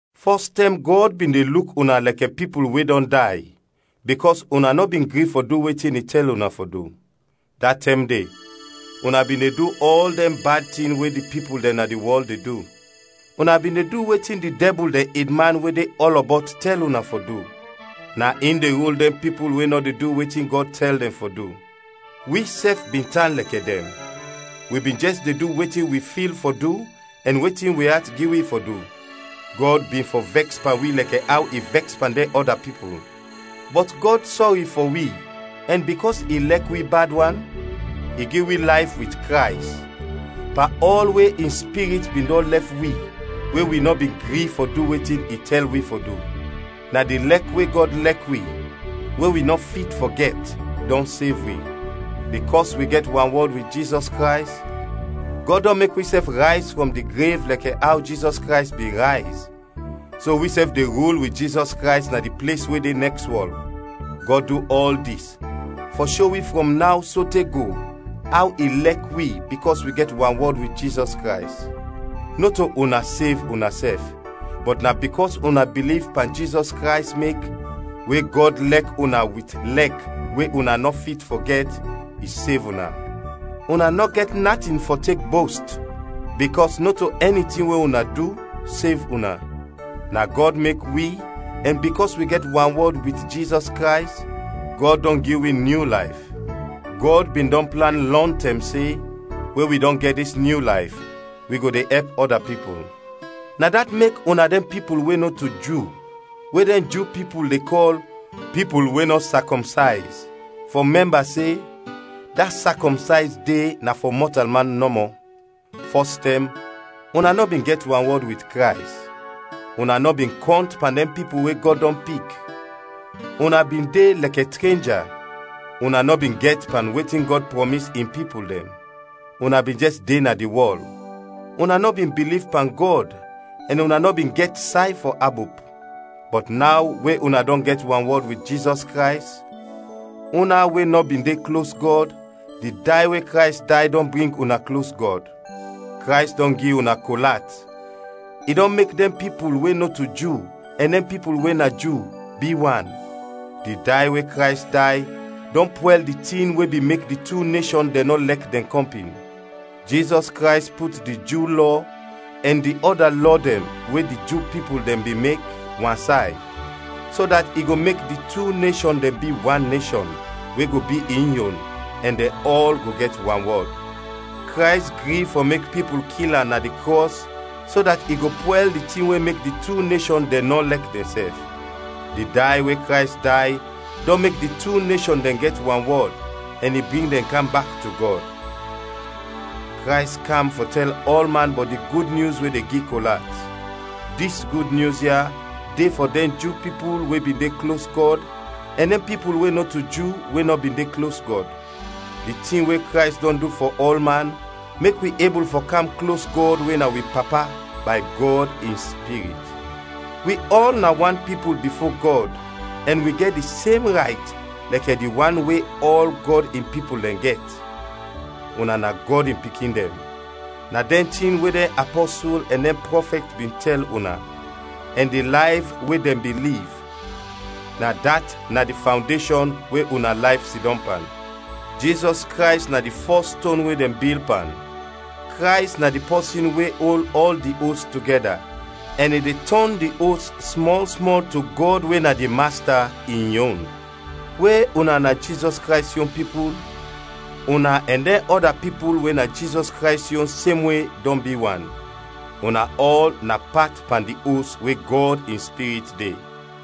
Fɔs tɛm Gɔd bin de luk una lɛkɛ pipul we dɔn day, bikɔs una nɔ bin gri fɔ du wetin i tɛl una fɔ du. Da tɛm de una bin de du ɔl dɛn bad tin we di pipul dɛn na di wɔl de du. Una bin de du wetin di dɛbul dɛn edman we de ɔlɔbɔt tɛl una fɔ du, na in de rul dɛn pipul we nɔ de du wetin Gɔd tɛl dɛn fɔ du. Wisɛf bin tan lɛkɛ dɛn, wi bin jɛs de du wetin wi fil fɔ du ɛn wetin wi at gi wi fɔ du; Gɔd bin fɔ vɛks pan wi lɛkɛ aw i vɛks pan dɛn ɔda pipul. Bɔt Gɔd sɔri fɔ wi ɛn bikɔs i lɛk wi bad wan, i gi wi layf wit Krays, pan ɔl we in Spirit bin dɔn lɛf wi we wi nɔ bin gri fɔ du wetin i tɛl wi fɔ du. Na di lɛk we Gɔd lɛk wi we wi nɔ fit fɔ gɛt dɔn sev wi. Bikɔs wi gɛt wanwɔd wit Jizɔs Krays, Gɔd dɔn mek wisɛf rayz frɔm di grev lɛkɛ aw Jizɔs Krays bin rayz, so wisɛf de rul wit Jizɔs Krays na di ples we de nɛks wɔl. Gɔd du ɔl dis fɔ sho wi frɔm naw sote go aw i lɛk wi bikɔs wi gɛt wanwɔd wit Jizɔs Krays. Nɔto una sev unasɛf, bɔt na bikɔs una biliv pan Jizɔs Krays mek, we Gɔd lɛk una wit lɛk we una nɔ fit fɔ gɛt, i sev una. Una nɔ gɛt natin fɔ tek bost, bikɔs nɔto ɛni tin we una du, sev una. Na Gɔd mek wi ɛn bikɔs wi gɛt wanwɔd wit Jizɔs Krays, Gɔd dɔn gi wi nyu layf. Gɔd bin dɔn plan lɔntɛm se we wi dɔn gɛt dis nyu layf, wi go de ɛp ɔda pipul. Na dat mek una dɛn pipul we nɔto Ju we dɛn Ju pipul de kɔl “pipul we nɔ sakɔmsayz,” fɔ mɛmba se, da sakɔmsayz de na fɔ mɔtalman nɔmɔ. Fɔstɛm una nɔ bin gɛt wanwɔd wit Krays. Una nɔ bin kɔnt pan dɛn pipul we Gɔd dɔn pik; una bin de lɛkɛ trenja. Una nɔ bin gɛt pan wetin Gɔd prɔmis in pipul dɛn. Una bin jɛs de na di wɔl; una nɔ bin biliv pan Gɔd ɛn una nɔ bin gɛt say fɔ abop. Bɔt naw we una dɔn gɛt wanwɔd wit Jizɔs Krays, una we nɔ bin de klos Gɔd, di day we Krays day dɔn bring una klos Gɔd. Krays dɔn gi una kol at, i dɔn mek dɛn pipul we nɔto Ju ɛn dɛn pipul we na Ju, bi wan. Di day we Krays day dɔn pwɛl di tin we bin mek di tu neshɔn dɛn nɔ lɛk dɛn kɔmpin. Jizɔs Krays put di Ju Lɔ ɛn di ɔda lɔ dɛn we di Ju pipul dɛn bin mek, wansay, so dat i go mek di tu neshɔn dɛn bi wan neshɔn we go bi in yon ɛn dɛn ɔl go gɛt wanwɔd. Krays gri fɔ mek pipul kil am na di krɔs so dat i go pwɛl di tin we mek di tu neshɔn dɛn nɔ lɛk dɛnsɛf. Di day we Krays day dɔn mek di tu neshɔn dɛn gɛt wanwɔd, ɛn i bring dɛn kam bak to Gɔd. Krays kam fɔ tɛl ɔlman bɔt di Gud Nyus we de gi kol at. Dis Gud Nyus ya de fɔ dɛn Ju pipul we bin de klos Gɔd ɛn dɛn pipul we nɔto Ju we nɔ bin de klos Gɔd. Di tin we Krays dɔn du fɔ ɔlman mek wi ebul fɔ kam klos Gɔd we na wi Papa bay Gɔd in Spirit. Wi ɔl na wan pipul bifo Gɔd ɛn wi gɛt di sem rayt lɛkɛ di wan we ɔl Gɔd in pipul dɛn gɛt, una na Gɔd in pikin dɛn. Na dɛn tin we dɛn apɔsul ɛn dɛn prɔfɛt bin tɛl una, ɛn di layf we dɛn bin liv, na dat na di fawndeshɔn we una layf sidɔm pan. Jizɔs Krays na di fɔs ston we dɛn bil pan. Krays na di pɔsin we ol ɔl di os togɛda, ɛn i de tɔn di os smɔl smɔl to Gɔd we na di Masta, in yon. We una na Jizɔs Krays yon pipul, una ɛn dɛn ɔda pipul we na Jizɔs Krays yon semwe dɔn bi wan, una ɔl na pat pan di os we Gɔd in Spirit de.